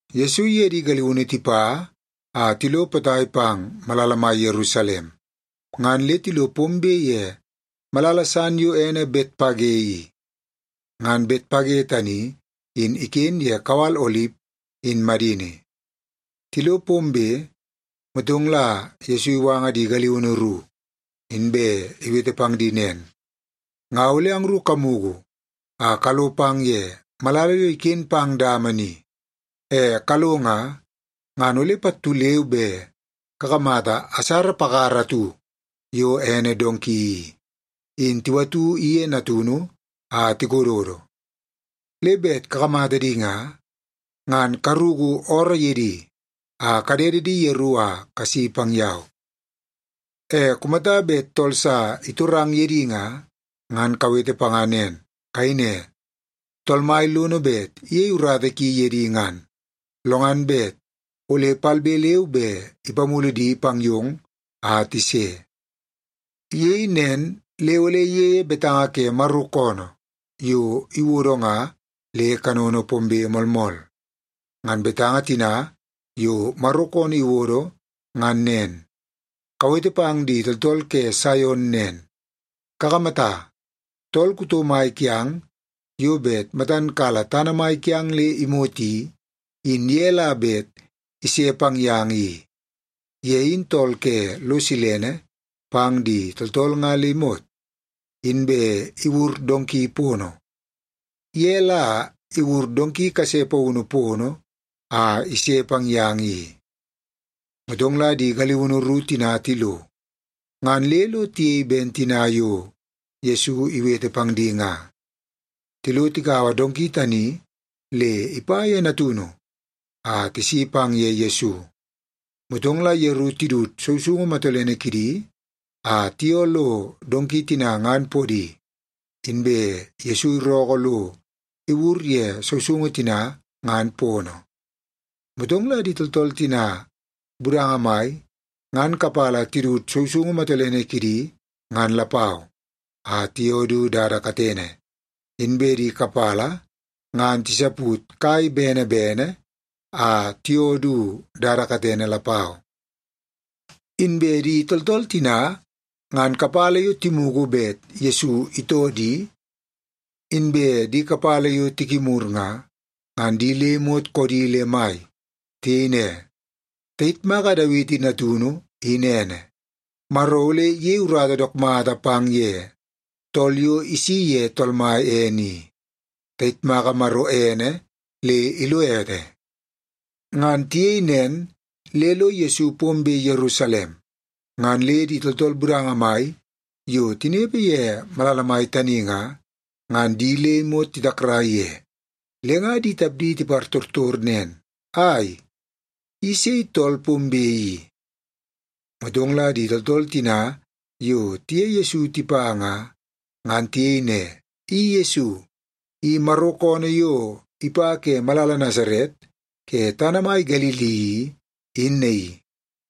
Yesu iye di galiunu tipa a tilo potai pang malala mai Yerusalem, ngan le tilo pombe ye malala san yo ene Betpage i. Ngan Betpage tani in iken ye kawal Olip in madini. Tilo pombe, motong la Yesu iwanga di galiunu ru, inbe iwete pang di nen, “Nga ole angru kamugu a kalo pang ye malala yo iken pang dama ni. E kalo nga, ngan ole pattu leu be kakamata asara pakara atu yo ene donki i, in tiwatu iye natunu a tikododo. Le bet kakamata di nga, ngan karuku ooroo ye di a kadede di yeru a kasi pang yau. E kumata bet tool sa itorang ye di nga, ngan kawete panga nen. Kayei ne, ‘Tool Mai lono bet iyei urata ki ye di ngan, lo ngan bet ole palbe leu be ipamulu di pang yong a tise.’” Iyei nen le ole iyeie betanga ke Maro koonoo yo iwodo nga le kanono pombe moolmool. Ngan betanga tina yo Maro koonoo iwodo ngan nen, “Kawete pang di tooltool ke Saion nen, ‘Kakamata, tool kuto mai kiang yo bet matan kala tana mai kiang le imot i, in ye la bet ise pang yang i. Ye in tool ke lo silene pang di tooltool nga le imot, inbe iwur donki pono. Ye la iwur donki kase paunu pono a ise pang yang i.’” Motong la di galiunu ru tina tilo, ngan le lo tiyei ben tina yo Yesu iwete pang di nga. Tilo tikaua donki tani le ipa ye natunu a tisi pang ye Yesu. Motong la yeru tidut sousoungu matolene kidi a tiyoo lo donki tina ngan podi, inbe Yesu irookoo lo iwur ye sousoungu tina ngan pono. Motong la di tooltool tina budanga mai ngan kapala tidut sousoungu matolene kidi ngan lapau, a tiyoo du dada katene, inbe di kapala ngan tisaput kai bene bene a tiyoo du dada katene lapau. Inbe di tooltool tina ngan kapala yo timugu bet Yesu itoo di, inbe di kapala yo tikimur nga, ngan di le imot koodi le mai. Tiyei ne, “Tayitmaka Dawiti natunu in ene! Maro ole iyei urata dook mata pang ye tool yo isi ye Tool Mai ene i! Tayitmaka Maro ene le ilo ete!” Ngan tiyei nen le lo Yesu pombe Yerusalem, ngan le di tooltool budanga mai yo tinepe ye malala mai tani nga, ngan di le imot titakrai ye, le nga di tapdi tipartortor nen, “Ai, i sei tool pombe i?” Motong la di tooltool tina yo tiye Yesu tipa nga, ngan tiyei ne, “I Yesu! I Maro koonoo yo ipa ke malala Nasaret ke tana mai Galili i, in naii.”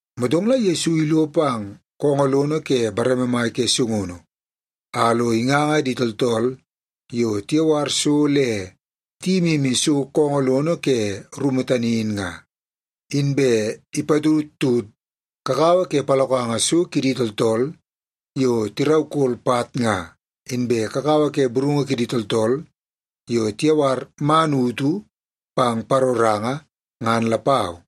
Motong la Yesu ilo pang koongoo lono ke bareme mai ke sungunu, a lo inganga di tooltool yo tiyawar so le tiyimimi so koongoo lono ke rumu tani in nga. Inbe ipatudtud kakawa ke palokanga so kidi tooltool yo tiraukol pat nga, inbe kakawa ke burungu kidi tooltool yo tiyawar man utu pang paroranga, ngan lapau.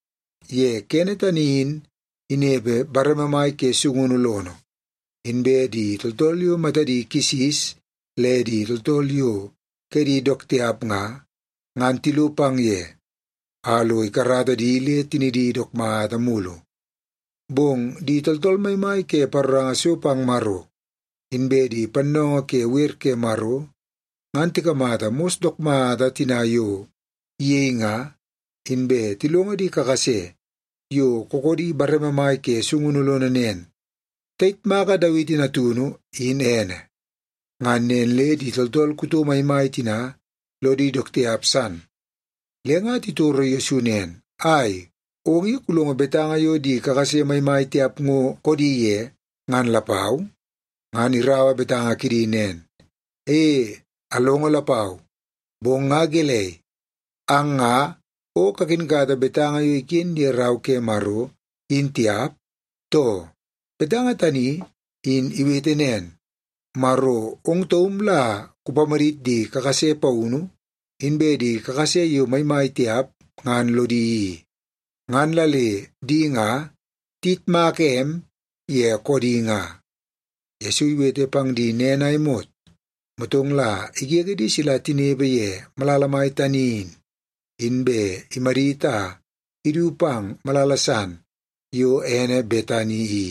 Ye kene tani in inepe bareme mai ke sungunu lono, inbe di tooltool yo matadi kisis le di tooltool yo kedi dook tiap nga, ngan tilo pang ye, a lo ikarata di le tinidi dook mata mulu. Bong di tooltool maimai ke paroranga so pang Maro, inbe di pannoongoo ke wer ke Maro, ngan tikamata mos dook mata tina yo iyei nga, inbe tilongo di kakase yo kookoodi bareme mai ke sungunu lono nen, “Tayitmaka Dawiti natunu, in ene!” Ngan nen le di tooltool kuto maimai tina lodi dook tiap san. Le nga titoro Yesu nen, “Ai, ong i kulongo betanga yo di kakase maimai tiap ngo koodi ye ngan lapau?” Ngan iraua betanga kidi nen, “E, alongo lapau. Bong nga gelei, ang nga o kakinkata betanga yo iken ye Rau ke Maro, in tiap, too? Betanga tani in iwete nen, ‘Maro ong taum la kupamadit di kakase paunu inbe di kakase yo maimai tiap ngan lodi i, ngan la le di nga tiyitmaka em ye koodi nga.’” Yesu iwete pang di nen a imot, motong la igege di sila tinepe ye malala mai tani in, inbe imadit a idu pang malala san yo ene Betani i,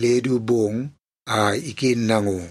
le du bong a iken nango.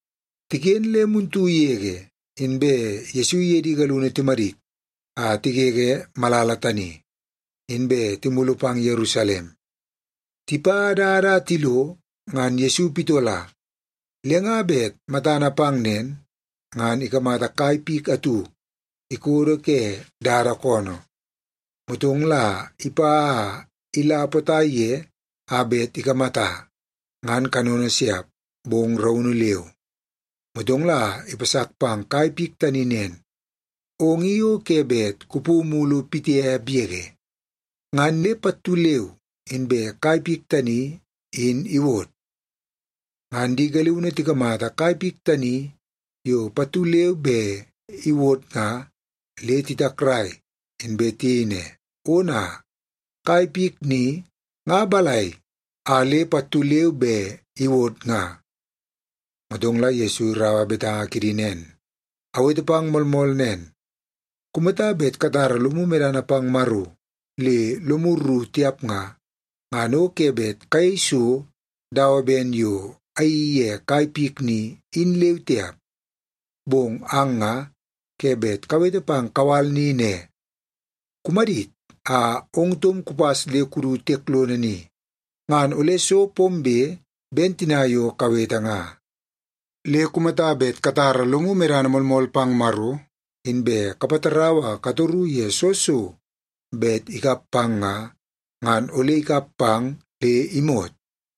Tiken le muntu yege, inbe Yesu iye di galiunu timadit a tigege malala tani, inbe timulu pang Yerusalem. Tipa dada a tilo ngan Yesu pitola. Le nga bet matana pang nen, ngan ikamata kai pik atu ikodo ke dada koonoo. Motong la ipa a ila potai ye a bet ikamata, ngan kanono siap, bong raunu leu. Motong la ipasak pang kai pik tani nen, “Ong i o ke bet kupu mulu pitiap yege.” Ngan le pattu leu inbe kai pik tani in iwod. Ngan di galiunu tikamata kai pik tani yo pattu leu be iwod nga, le titakrai, inbe tiyei ne, “Ona, kai pik ni nga balai a le pattu leu be iwod nga?” Motong la Yesu iraua betanga kidi nen, “Awete pang moolmool nen. Kumata bet katara lomu medana pang Maro le lomu rru tiap nga, ngan o ke bet kayei so dawa ben yo ayeii ye kai pik ni, in leu tiap. Bong ang nga ke bet kawete pang kawal ni ne, ‘Kumadit a ong taum kupas le kudu tiek lono ni,’ ngan ole so pombe ben tina yo kawete nga. Le kumata bet katara lomu medana moolmool pang Maro, inbe kapatarau a katoru ye soo so bet ikap pang nga, ngan ole ikap pang le imot.”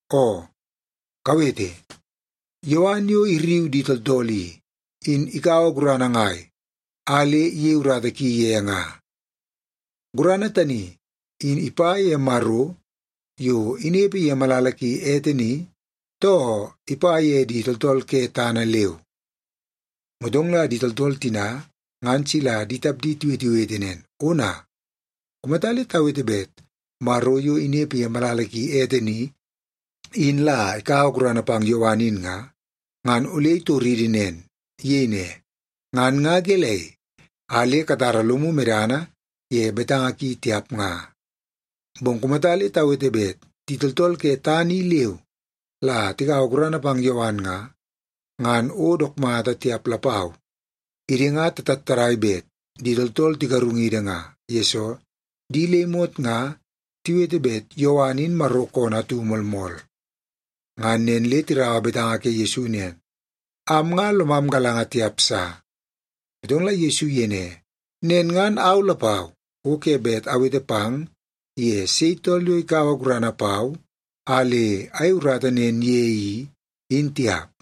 Oo, kawete! Yowan yo irriu di tooltool i, in ikaua gurana ngai a le iyei urata ki ye nga? Gurana tani in ipa ye Maro yo inepe ye malala ki ete ni, too ipa ye di tooltool ke tana leu?” Motong la di tooltool tina ngan sila di tapdi tiwetewete nen, “Ona! Kumata le tawete bet Maro yo inepe ye malala ki ete ni, in la ikaua gurana pang Yowan in nga, ngan ole itoridi nen. Iyei ne, ‘Ngan nga gelei a le katara lomu medana ye betanga ki tiap nga?’ Bong kumata le tawete bet di tooltool ke tana i leu la tikaua gurana pang Yowan nga, ngan o dook mata tiap lapau. Idi nga tatattadai bet di tooltool tigarungidi nga, yesoo di le imot nga tiwete bet Yowan in Maro koonoo atu moolmool.” Ngan nen le tiraua betanga ke Yesu nen, “Am nga lomam galanga tiap sa.” Motong la Yesu iyei ne, “Nen ngan au lapau, o ke bet awete pang ye sei tool yo ikaua gurana pau a le ayei urata nen ye i, in tiap.”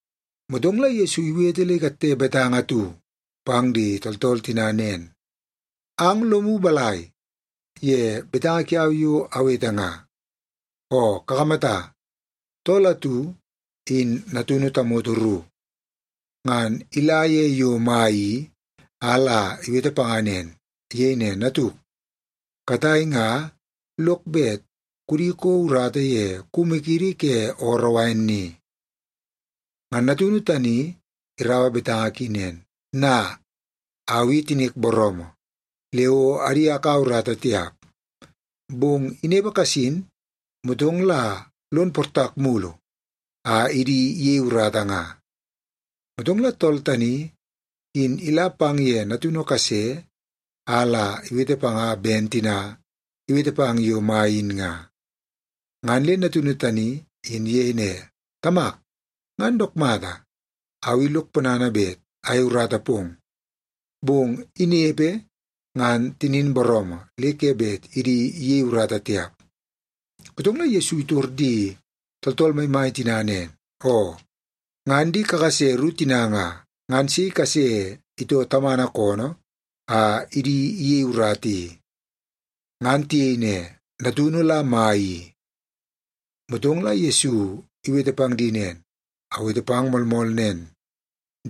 Motong la Yesu iwete le ikatte betanga atu pang di tooltool tina nen, “Ang lomu balai ye betanga kiau yo awete nga? Oo kakamata, tool atu in natunu tamoto ru. Ngan ila ye yo mai i a la iwete panga nen. Iyei ne, ‘Natuk, katai nga lok bet kudi kouo urata ye kumu kiidi ke ooroo wain ni.’ “Ngan natunu tani iraua betanga ki nen, ‘Na, au i tinik booroomoo, le o adi akaua urata tiap.’ Bong inepe kasin, motong la lon portak mulu a idi iyei urata nga. “Motong la tool tani, in ila pang ye natunu kase a la iwete panga ben tina iwete pang yo mai in nga. Ngan le natunu tani in iyei ne, ‘Tamak, ngan dook mata. Au i lok ponana bet ayei urata pong.’ Bong inepe, ngan tinin booroomoo le ke bet idi iyei urata tiap.” Motong la Yesu itor di tooltool maimai tina nen, “Oo, ngan di kakase ru tina nga, ngan sei kase itoo tamana koonoo a idi iyei urata i?” Ngan tiyei ne, “Natunu la mai i.” Motong la Yesu iwete pang di nen, “Awete pang moolmool nen,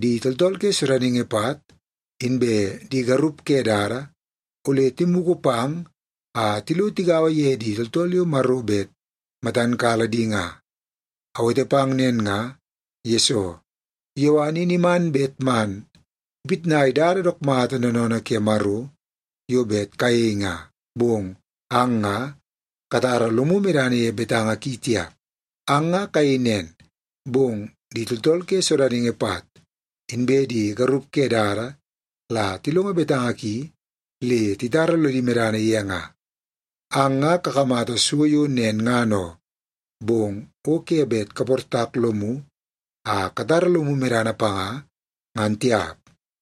di tooltool ke sodaningi pat, inbe di garup ke dada, ole timugu pang a tilo tigaua ye di tooltool yo Maro bet matan kala di nga. Awete pang nen nga, yesoo Yowan in iman bet man ipitnai dada dook mata noonoonoo ke Maro yo bet kayei nga, bong ang nga katara lomu medana ye betanga ki tiap. Ang nga kayei nen, bong di tooltool ke sodaningi pat, inbe di garup ke dada la tilongo betanga ki le titara lodi medana ye nga. Ang nga kakamata so yo nen ngan oo, bong o ke bet kaportak lomu a katara lomu medana panga, ngan tiap.”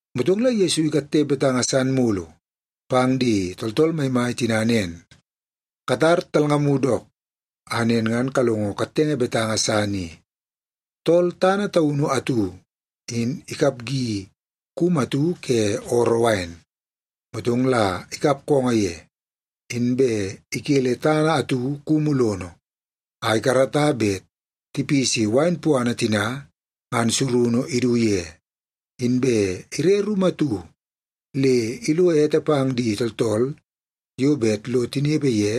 Motong la Yesu ikatte betanga san mulu pang di tooltool maimai tina nen, “Katar talngamu dook, a nen ngan kalongo kattenge betanga san i. Tool tana taunu atu in ikapgi kumu atu ke ooroo wain, motong la ikap koongoo ye. Inbe ikele tana atu kumu lono a ikarata bet tipisi wain puana tina ngan surunu idu ye. Inbe ire rumu atu le ilo ete pang di tooltool yo bet lo tinepe ye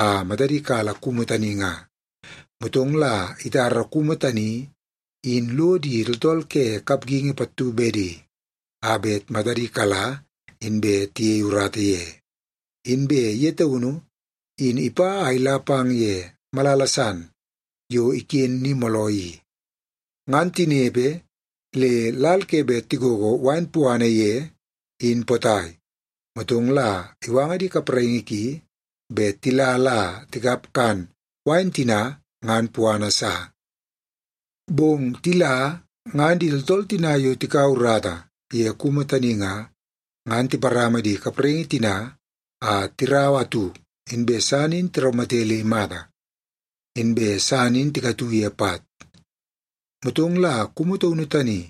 a matadi kala kumu tani nga. Motong la itara kumu tani in lo di tooltool ke kapgingi pattu bedi, a bet matadi kala, inbe tiyei urata ye. Inbe ye taunu in ipa a ila pang ye malala san yo iken ni mooloo i. Ngan tinepe le lal ke bet tigogo wain puana ye in potai, motong la iwanga di kapraingi ki bet tila la tikap kan wain tina ngan puana sa. “Bong tila, ngan di tooltool tina yo tikaua urata ye kumu tani nga, ngan tiparama di kapraingi tina a tiraua atu, inbe san in tiraumate le imata, inbe san in tikatu ye pat. Motong la kumu taunu tani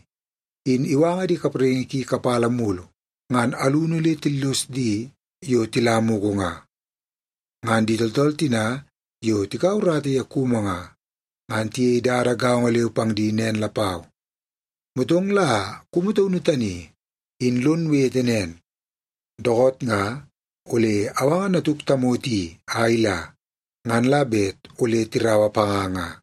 in iwanga di kapraingi ki kapala mulu, ngan alunu le tillos di yo tila mugu nga. Ngan di tooltool tina yo tikaua urata ye kumu nga, ngan tiyei dada gaongo leu pang di nen lapau. Motong la kumu taunu tani, in lon wete nen, ‘Dookoot nga ole awanga natuk tamoto i a ila, ngan la bet ole tiraua panga nga.’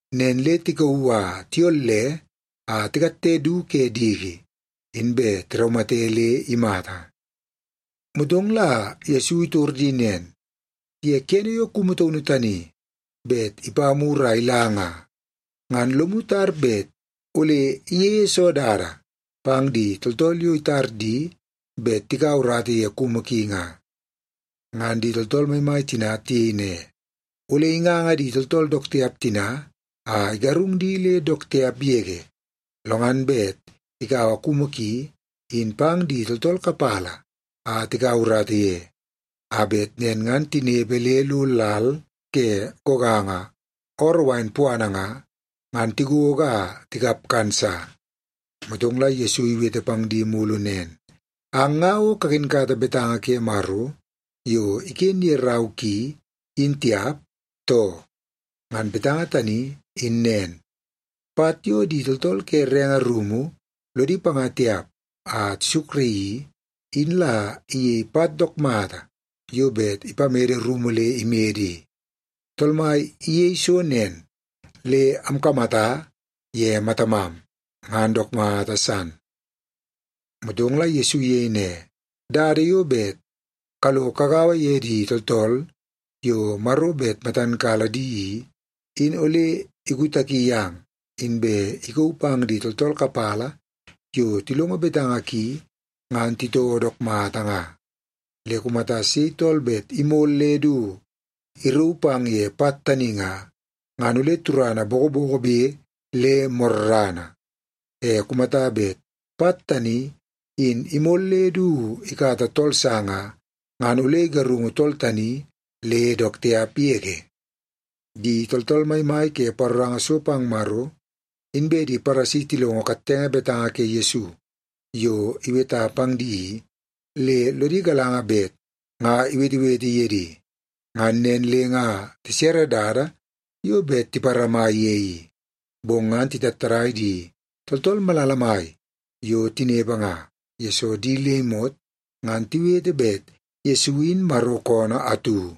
Nen le tikauu a tiyolle a tikatte du ke diki, inbe tiraumate le imata.” Motong la Yesu itor di nen, “Ye kene yo kumu taunu tani bet ipa mur a ila nga, ngan lomu tar bet ole iyeie soo dada pang di tooltool yo itar di bet tikaua urata ye kumu ki nga?” Ngan di tooltool maimai tina tiyei ne, “Ole inganga di tooltool dook tiap tina a igarung di le dook tiap yege. Lo ngan bet ikaua kumu ki in pang di tooltool kapala a tikaua urata ye, a bet nen ngan tinepe le lo lal ke goganga ooroo wain puana nga, ngan tigogo a tikap kan sa.” Motong la Yesu iwete pang di mulu nen, “Ang nga o kakinkata betanga ke Maro yo iken ye rau ki, in tiap, too? Ngan betanga tani in nen, ‘Pat yo di tooltool ke renge rumu lodi panga tiap a tisukraii i, in la iyei pat dook mata yo bet ipamede rumu le imede i. Tool Mai iyeie so nen, le amkamata ye matamam, ngan dook mata san.’” Motong la Yesu iyei ne, “Dada yo bet kalo kagaua ye di tooltool yo Maro bet matan kala di i, in ole ikutaki yang, inbe ikauu pang di tooltool kapala yo tilongo betanga ki ngan titoo dook mata nga. Le kumata sei tool bet imol le du irauu pang ye pat tani nga, ngan ole turana bokobokobe le morrana. E kumata bet pat tani in imol le du ikata tool sa nga, ngan ole igarungu tool tani le dook tiap yege.” Di tooltool maimai ke paroranga so pang Maro, inbe di Paresi tilongo kattenge betanga ke Yesu yo iweta pang di i, le lodi galanga bet nga iwetewete ye di. Ngan nen le nga tisere dada yo bet tiparama ye i, bong ngan titattadai di tooltool malala mai yo tinepe nga, yesoo di le imot ngan tiwete bet Yesu in Maro koonoo atu.